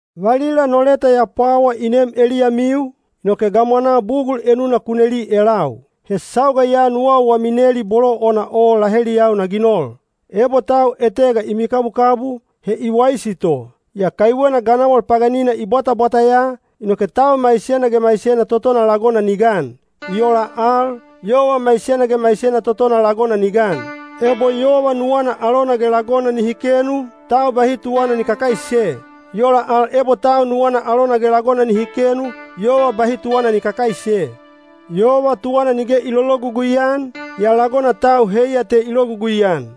Valila no leta ya pwawa i neem eliyamiu, inoke gamwanaa bugul enuna ku neli elau. He sauga ya nuwau wami neli bolo ona o laheliyau na ginol. Ebo tau etega i mikabukabu, he i waisi to. Yaa kaiwena ganawal paganina i bwatabwata ya, inoke tau maisena ge maisena totona lagona ni gan. I ola al, yova maisena ge maisena totona lagona ni gan. Ebo yova nuwana alona ge lagona nihi kenu, tau bahi tuwana ni kakaise. I ola al ebo tau nuwana alona ge lagona nihi kenu, yova bahi tuwana ni kakaise. Yova tuwana nige i lologugui-an, yaa lagona tau heiya te i logugui-an.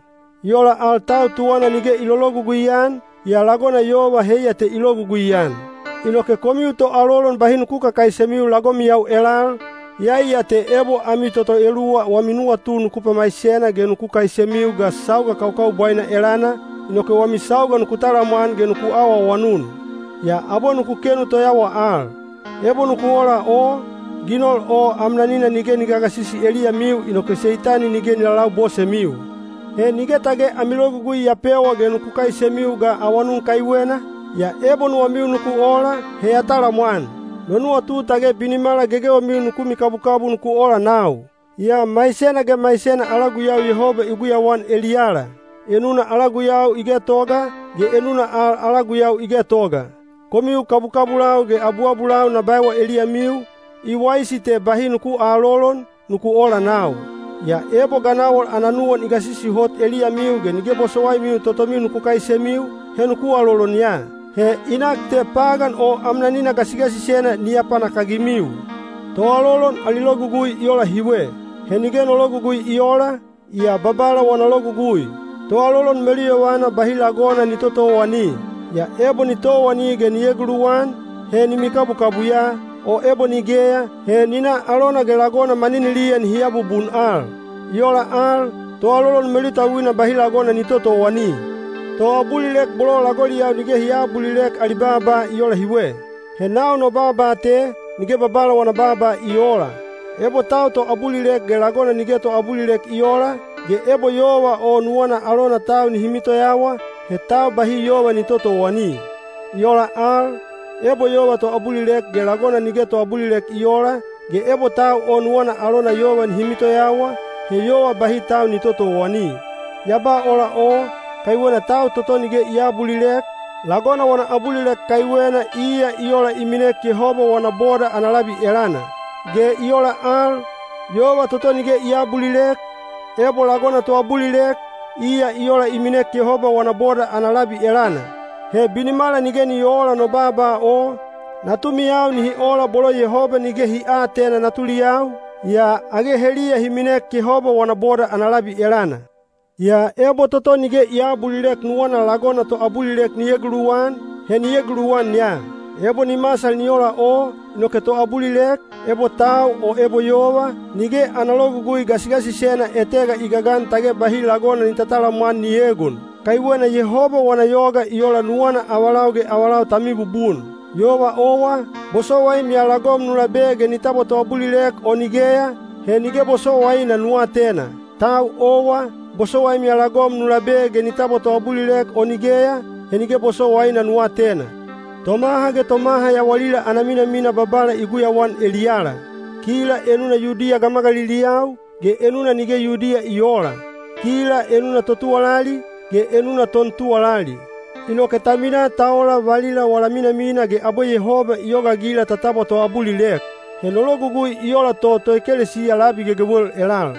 I ola al tau tuwana nige i lologugui-an, yaa lagona yova heiya te i logugui-an. Inoke komiu toalolon bahi nuku kakaisemiu lagomiyau elal, iyai ya te ebo ami toto eluwa wami nuwatu nuku pamaisena ge nuku kaisemiu ga sauga kaukaubwaina elana, inoke wami sauga nuku talamwan ge nuku awaawanun. Yaa abwe nuku kenu toyawa al. Ebo nuku ola o, ginol o amnanina nige ni gagasisi eliyamiu inoke Seitani nige ni lalabosemiu. He nige tage ami logugui ya pewa ge nuku kaisemiu ga awanun kaiwena, yaa ebo nuwamiu nuku ola, he ya talamwan. No nuwatu tage binimala gegewemiu nuku mikabukabu nuku ola nau. Yaa maisena ge maisena ala guyau Yehoba i guyauan eliyala. Enuna ala guyau i getoga, ge enuna al ala guyau i getoga. Komiu kabukabulau ge abuabulau na baewa eliyamiu, “I waisi te bahi nuku aalolon, nuku ola nau. Yaa ebo ganawal ana nuwan i gasisi hot eliyamiu ge nige bosowaimiu totomiu nuku kaisemiu, he nuku alolon ya. He i nak te pagan o amnanina gasigasisena ni apanakagimiu.” Toalolon ali logugui i ola hiwe. He nige no logugui i oola, yaa Babala wana logugui. Toalolon meluyovana bahi lagona ni totowani. Yaa ebo ni towani ge ni eguluwan, he ni mikabukabu ya, o ebo nigeya, he ni na alona ge lagona maniniliya nihi abubun al. I ola al, toalolon melutauina bahi lagona ni totowani. Toabulilek bolo lagoliyau nige hi aabulilek ali baaba i ola hiwe. He nau no baaba te, nige Babala wana baaba i oola. Ebo tau toabulilek ge lagona nige toabulilek i oola, ge ebo yova o nuwana alona tau nihi mitoyawa, he tau bahi yova ni totowani. I ola al, ebo yova toabulilek ge lagona nige toabulilek i oola, ge ebo tau o nuwana alona yova nihi mitoyawa, he yova bahi tau ni totowani. Ya ba ola o, kaiwena tau toto nige i aabulilek, lagona wana abulilek kaiwena iya i ola i minek Yehoba wana boda ana labi elana. Ge i ola al, yova toto nige i aabulilek, ebo lagona toabulilek, iya i ola i minek Yehoba wana boda ana labi elana. He binimala nige ni oola no baaba o, natumiyau nihi ola bolo Yehoba nige hi aatena natuliyau, yaa age heliya hi minek Yehoba wana boda ana labi elana. Yaa ebo toto nige i aabulilek nuwana lagona toabulilek ni eguluwan, he ni eguluwan ya. Ebo ni masal ni ola o, inoke toabulilek, ebo tau o ebo yova, nige ana logugui gasigasisena etega i gagan tage bahi lagona ni tatalamwan ni egon. Kaiwena Yehoba wana yoga i ola nuwana avalau ge avalau ta mibubun. Yova owa, bosowaim ya lagom nu labe ge ni tabwa toabulilek o nigeya, he nige bosowaina nu atena. Tau owa, bosowaim ya lagom nu labe ge ni tabwa toabulilek o nigeya, he nige bosowaina nu atena. Tomaha ge tomaha yawalila ana minamina Babala i guyauan eliyala. Kila enuna Yudiya gamagaliliyau, ge enuna nige Yudiya i oola. Kila enuna totuwalali, ge enuna tontuwalali. Inoke ta minaa ta ola valila wala minamina ge abwe Yehoba i yogaagila ta tabwa toabulilek. He no logugui i ola to toekelesiya labi gegewel elal.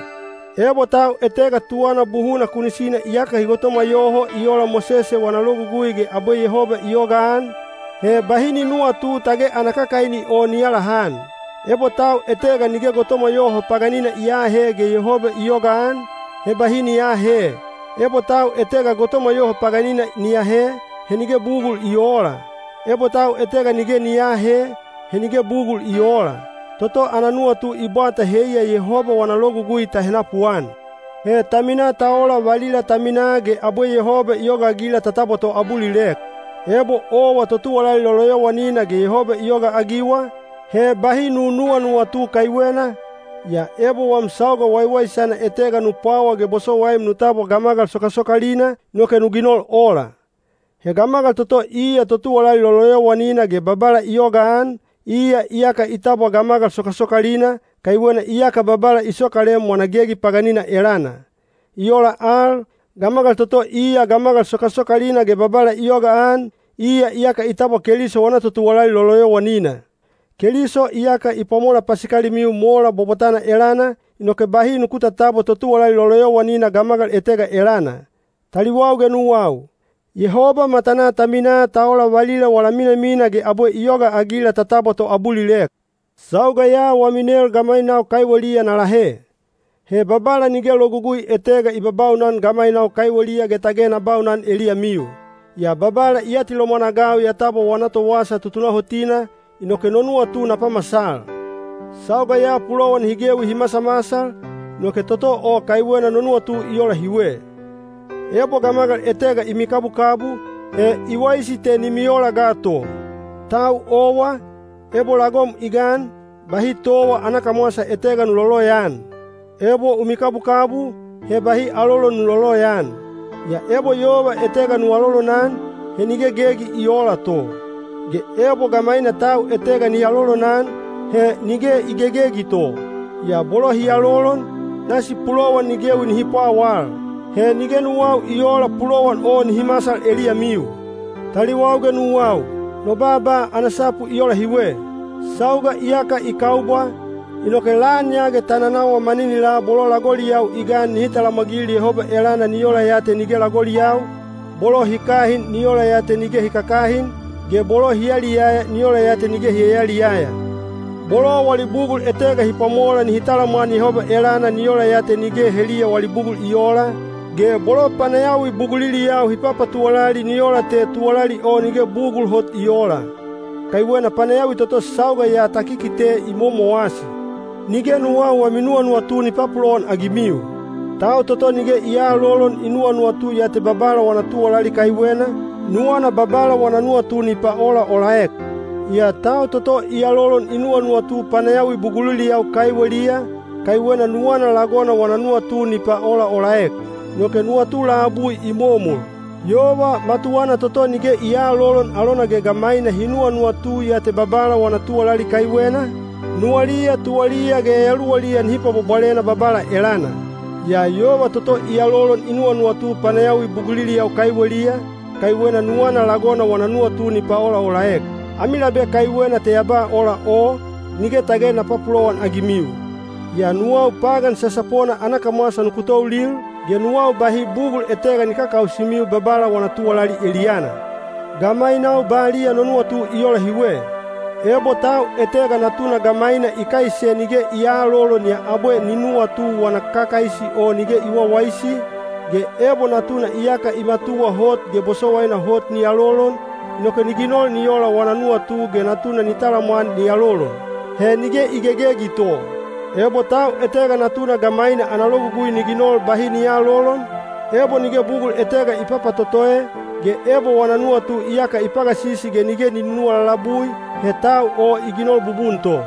Ebo tau etega tuwana buhuna kunisina iyaka hi gotomwa yoho i ola Mosese wana Logugui ge abwe Yehoba i yogaan, he bahi ni nuwatu tage ana kakaini o ni alahan. Ebo tau etega nige gotomwa yoho paganina i aahe ge Yehoba i yogaan, he bahi ni aahe. Ebo tau etega gotomwa yoho paganina ni ahe, he nige bugul i oola. Ebo tau etega nige ni aahe, he nige bugul i oola. Toto ana nuwatu i bwata heiya Yehoba wana logugui ta henapuan. He ta minaa ta ola valila ta minaa ge abwe Yehoba i yogaagila ta tabwa toabulilek. Ebo owa totuwalali loloyowanina ge Yehoba i yogaagiwa, he bahi nu nuwanuwatu kaiwena—yaa ebo wam sauga waiwaisana etega nu pwawa ge bosowaim nu tabwa gamagal sokasokalina, inoke nu ginol ola. He gamagal toto iya totuwalali loloyowanina ge Babala i yogaan, iya iyaka i tabwa gamagal sokasokalina, kaiwena iyaka Babala i sokalem wana gegi paganina elana. I ola al, gamagal toto iya gamagal sokasokalina ge Babala i yogaan, iya iyaka i tabwa Keliso wana totuwalali loloyowanina. Keliso iyaka i pwamola pasikalimiu mola bwabwatana elana, inoke bahi nuku tatabwa totuwalali loloyowanina gamagal etega elana. Taliwau ge nuwau, Yehoba matanaa ta minaa ta ola valila wala minamina ge abwe i yogaagila ta tabwa toabulilek. Sauga ya wami nel gamainau kaiweliya na lahe. He Babala nige logugui etega i babaunan gamainau kaiweliya ge tage na baunan eliyamiu. Yaa Babala i atilomwan-agau ya tabwa wana towasa tutunahotina, inoke no nuwatu na pamasal. Sauga ya pulowan hi gewi hi masamasal, inoke toto o kaiwena no nuwatu i ola hiwe: ebo gamagal etega i mikabukabu, he i waisi te ni miola ga to. Tau owa, ebo lagom i gan, bahi towa ana kamwasa etega nu loloyaan. Ebo u mikabukabu, he bahi alolon nu loloyaan. Yaa ebo yova etega nu alolonan, he nige gegi i oola to. Ge ebo gamaina tau etega ni alolonan, he nige i gegegi to. Yaa bolo hi alolon, nasi pulowan ni gewi nihi pwawal. He nige nuwau i oola pulowan o nihi masal eliyamiu. Taliwau ge nuwau, no baaba ana sapu i ola hiwe. Sauga iyaka i kaubwa, inoke lan ya ge ta nanawa maninilaa bolo lagoliyau i gan nihi talamwagil Yehoba elana ni ola ya te nige lagoliyau, bolo hi kahin ni ola ya te nige hi kakahin, ge bolo hi yaliyaya ni ola ya te nige hi yayaliyaya. Bolo wali bugul etega hi pwamola nihi talamwan Yehoba elana ni ola ya te nige heliya wali bugul i oola, ge bolo panayawi buguliliyau hi papatuwalali ni ola te tuwalali o nige bugul hot i oola. Kaiwena panayawi toto sauga ya ta kikite i momowasi. Nige nuwau wami nuwanuwatu ni papulowan-agimiu. Tau toto nige i aalolon i nuwanuwatu ya te Babala wana tuwalali kaiwena, nuwana Babala wana nuwatu ni paolaolaek. Yaa tau toto i alolon i nuwanuwatu panayawi buguliliyau kaiweliya, kaiwena nuwana lagona wana nuwatu ni paolaolaek. Inoke nuwatu labui i momol. Yova matuwana toto nige i aalolon alona ge gamaina hi nuwanuwatu ya te Babala wana tuwalali kaiwena, nuwaliya tuwaliya ge yayaluwaliya nihi pwabwabwalena Babala elana. Yaa yova toto i alolon i nuwanuwatu panayawi buguliliyau kaiweliya, kaiwena nuwana lagona wana nuwatu ni paolaolaek. Ami labe kaiwena te ya ba ola o, nige tage na papulowan-agimiu. Yaa nuwau pagan sasapona ana kamwasa nuku toulil, ge nuwau bahi bugul etega ni kakausimiu Babala wana tuwalali eliyana. Gamainau baliya no nuwatu i ola hiwe. Ebo tau etega natuna gamaina i kaise nige i aalolon yaa abwe ni nuwatu wana kakaisi o nige i wawaisi, ge ebo natuna iyaka i matuwa hot ge bosowaina hot ni alolon, inoke ni ginol ni ola wana nuwatu ge natuna ni talamwan ni alolon. He nige i gegegi to. Ebo tau etega natuna gamaina ana logugui ni ginol bahi ni aalolon, ebo nige bugul etega i papatotoe, ge ebo wana nuwatu iyaka i pagasisi ge nige i nunuwa lalabui, he tau o i ginol bubun to.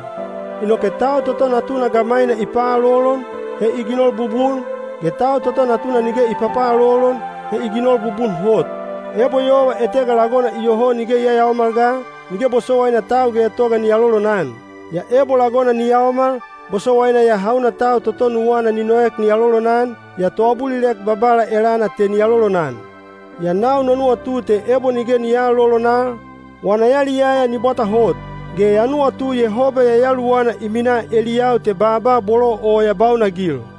Inoke tau toto natuna gamaina i paalolon, he i ginol bubun, ge tau toto natuna nige i papaalolon, he i ginol bubun hot. Ebo yova etega lagona iyoho nige i yayaomal ga, nige bosowaina tau getoga ni alolonan. Yaa ebo lagona ni yaomal, bosowaina ya hauna tau toto nuwana ni noek ni alolonan, yaa toabulilek Babala elana te ni alolonan. Yaa nau no nuwatu te ebo nige ni aalolon al, wana yaliyaya ni bwata hot. Ge ya nuwatu Yehoba Yayaluwana i minaa eliyau te baaba bolo o ya baunagil.